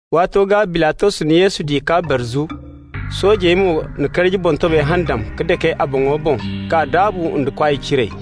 Waato gaa Bilatos na Yesu di k'a barzu. Soojey mo na karji boŋtobay handam ka dake a boŋo boŋ k'a daabu nda kwaay ciray.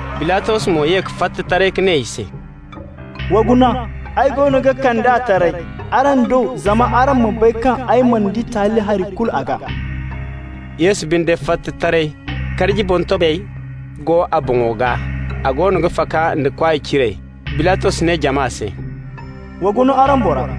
Bilatos mo ye ka fatta taray ka ne i se: «Wa guna, ay goono ga kand'a taray araŋ do zama araŋ ma bay kaŋ ay mana di taali hari kulu a gaa.» Yesu binde fatta taray, karji boŋtobay go a boŋo gaa, a goono ga faka da kwaay ciray. Bilatos ne jama se: «Wa guna araŋ bora!»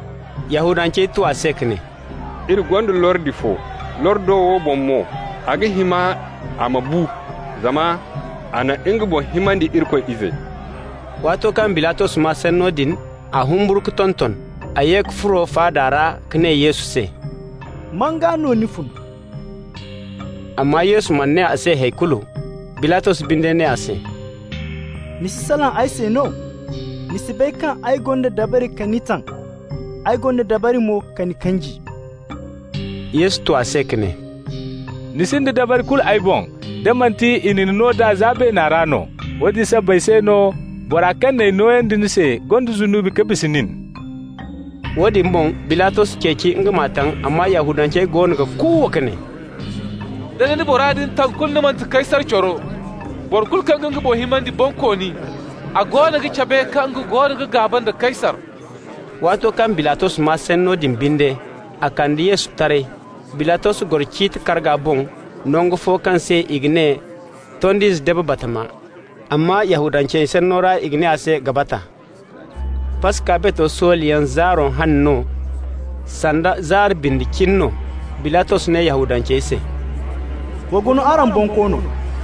Yahudancey tu a se ka ne: «Iri gonda lordi fo, lordo wo boŋ mo a ga hima a ma bu, zama a na nga boŋ himandi Irikoy Ize.» Waato kaŋ Bilatos maa sanno din, a humburu ka tonton. A ye ka furo faada ra ka ne Yesu se: «Man gaa no ni fun?» Amma Yesu mana ne a se hay kulu. Bilatos binde ne a se: «Ni si salaŋ ay se no? Ni si bay kaŋ ay gonda dabari ka ni taŋ, ay gonda dabari mo ka ni kanji?» Yesu tu a se ka ne: «Ni sinda dabari kulu ay boŋ, da manti i na ni no nd'a za beena ra no. Woodin sabbay se no bora kaŋ n'ay nooyandi ni se gonda zunubi ka bisa nin.» Woodin boŋ Bilatos ceeci nga m'a taŋ, amma Yahudancey goono ga kuuwa ka ne: «Da ni na bora din taŋ, kulu ni manti Kaysar coro. Boro kulu kaŋ ga nga boŋ himandi bonkooni, a goono ga cabe kaŋ nga goono ga gaaba nda Kaysar.» Waato kaŋ Bilatos maa sanno din binde, a kande Yesu taray. Bilatos goro ciiti karga boŋ, nangu fo kaŋ se i ga ne Tond'ize Dabe Batama, amma Yahudancey sanno ra i ga ne a se Gabata. Paska bato soolayaŋ zaaro hane no, sanda zaari bindi cine no. Bilatos ne Yahudancey se: «Wa guna araŋ bonkoono!»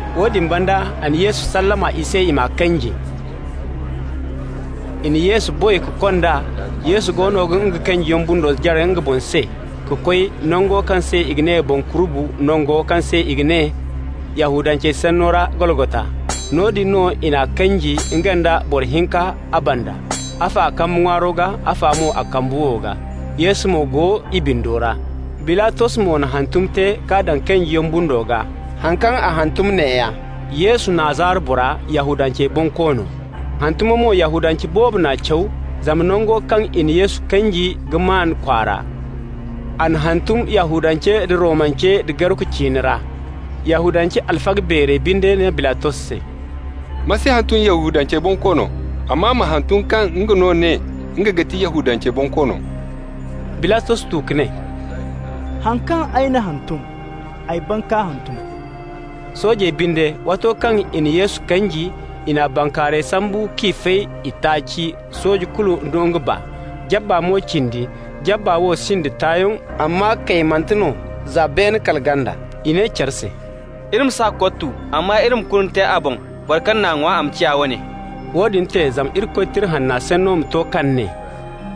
Woodin banda a na Yesu sallama i se, i m'a kanji. I na Yesu boy ka kond'a. Yesu goono ga nga kanjiyaŋ bundo jare nga boŋ se ka koy nango kaŋ se i ga ne Boŋ Kurubu, nango kaŋ se i ga ne Yahudancey sanno ra Golgota. Noodin no i n'a kanji, nga nda boro hinka a banda, afo a kambe ŋwaaro gaa, afa mo a kambe wow gaa, Yesu mo go i bindo ra. Bilatos mo na hantum te k'a daŋ kanjiyaŋ bundo gaa. Haŋ kaŋ a hantum neeya: «YESU, NAZARA BORA, YAHUDANCEY BONKOONO.» Hantumo mo, Yahudance boobo n'a caw, zama nango kaŋ i na Yesu kanji ga maan kwaara. A n'a hantum Yahudance, da Romance da Gareku ciine ra. Yahudance alfaga beerey binde ne Bilatos se: «Ma si hantum Yahudancey bonkoono, amma ma hantum kaŋ nga no ne nga ga ti Yahudancey bonkoono.» Bilatos tu ka ne: «Haŋ kaŋ ay n'a hantum, ay ban ka hantum.» Soojey binde, waato kaŋ i na Yesu kanji, i n'a bankaarayey sambu k'i fay itaaci, sooje kulu nda nga baa, jabba mo cindi. Jabba wo sinda tayaŋ, amma kaymante no za beene kala ganda. I ne care se: «Iri ma s'a kottu, amma iri ma kurne te a boŋ, boro kaŋ n'a ŋwa, a ma ciya a wane.» Woodin te zama Irikoy Tira Hanna sanno ma to kaŋ ne: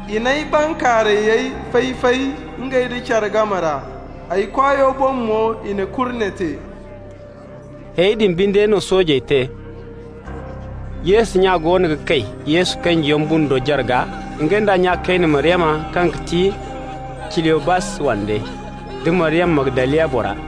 «I n'ay bankaarayey fay-fay ngey nda care game ra, ay kwaayo boŋ mo, i na kurne te.» Hayey din binde no soojey te. Yesu nya goono ga kay Yesu kanjiyaŋ bundo jarga, nga nd'a nya kayne, Maryama kaŋ ga ti Ciliyobas wande, da Maryama, Magdaliya bora.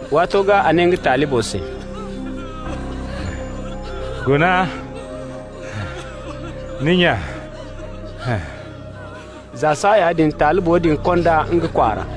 Waato gaa a ne nga talibo se: «Guna ni nya!» Za saaya din talibo din kond'a nga kwaara.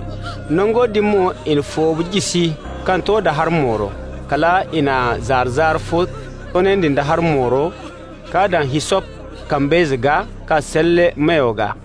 Nango din mo i na foobu jisi kaŋ to da hari mooro. Kal i na zaara-zaara fo toonandi nda hari mooro k'a daŋ hissop kambayze gaa ka salle a meyo gaa.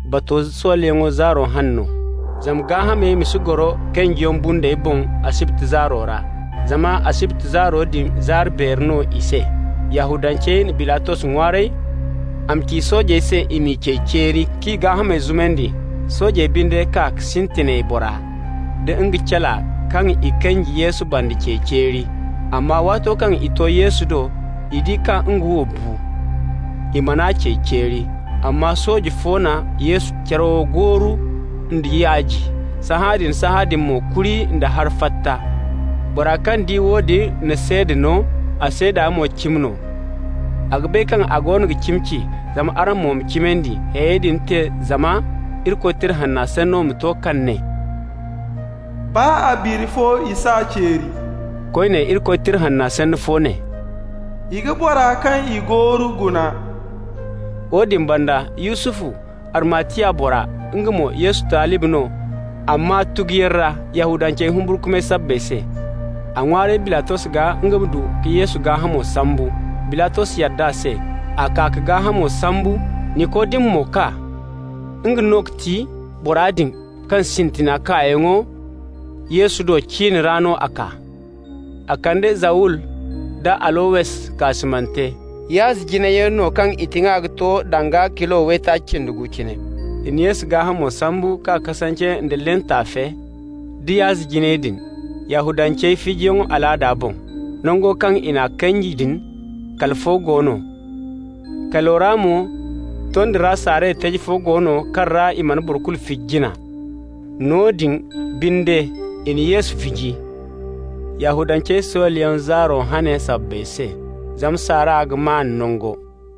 Bato soolayaŋ zaaro hane no. Zama gaahamey ma si goro kanjiyaŋ bundey boŋ asibti zaaro ra (zama asibti zaaro din zaari beeri no i se), Yahudancey na Bilatos ŋwaaray a ma ci soojey se i m'i cey ceeri k'i gaahamey zumandi. Soojey binde kaa ka sintinay bora da nga cala kaŋ i kanji Yesu banda cey ceeri. Amma waato kaŋ i to Yesu do, i di kaŋ nga wo bu. I mana a cey ceeri, amma sooje fo na Yesu carawo gooru nda yaaji. Sahãadin-sahãadin mo kuri nda hari fatta. Bora kaŋ di woodin na seeda no, a seeda mo cimi no. A ga bay kaŋ a goono ga cimi ci, zama araŋ mo ma cimandi. Hayey din te zama Irikoy Tira Hanna sanno ma to kaŋ ne: «Baa a biri fo, i s'a ceeri.» Koyne, Irikoy Tira Hanna sanno fo ne: «I ga bora kaŋ i gooru guna.» Woodin banda Yusufu, Arimatiya bora, (nga mo Yesu talibi no, amma tuguyaŋ ra Yahudancey humburkumay sabbay se), a ŋwaaray Bilatos gaa nga ma du ka Yesu gaahamo sambu. Bilatos yadd'a se. A kaa k'a gaahamo sambu. Nikodimu mo kaa (nga no ga ti bora din kaŋ a sintina kaayaŋo Yesu do, cin ra no a kaa.) A kande zawul nda alowes kaasumante (yaazi jinayyaŋ no kaŋ i tiŋa ga to danga kilo waytaaci cindi gu cine.) I na Yesu gaahamo sambu k'a kasance nda lin taafe da yaazi jinayey din, Yahudancey fijiyaŋ alaada boŋ. Nango kaŋ i n'a kanji din, kali fo go no. Kalo ra mo tondi ra saaray taji fo go no kaŋ ra i mana boro kulu fiji jina. Noodin binde i na Yesu fiji, Yahudancey soolayaŋ zaaro hane sabbay se, zama saara ga maan nango.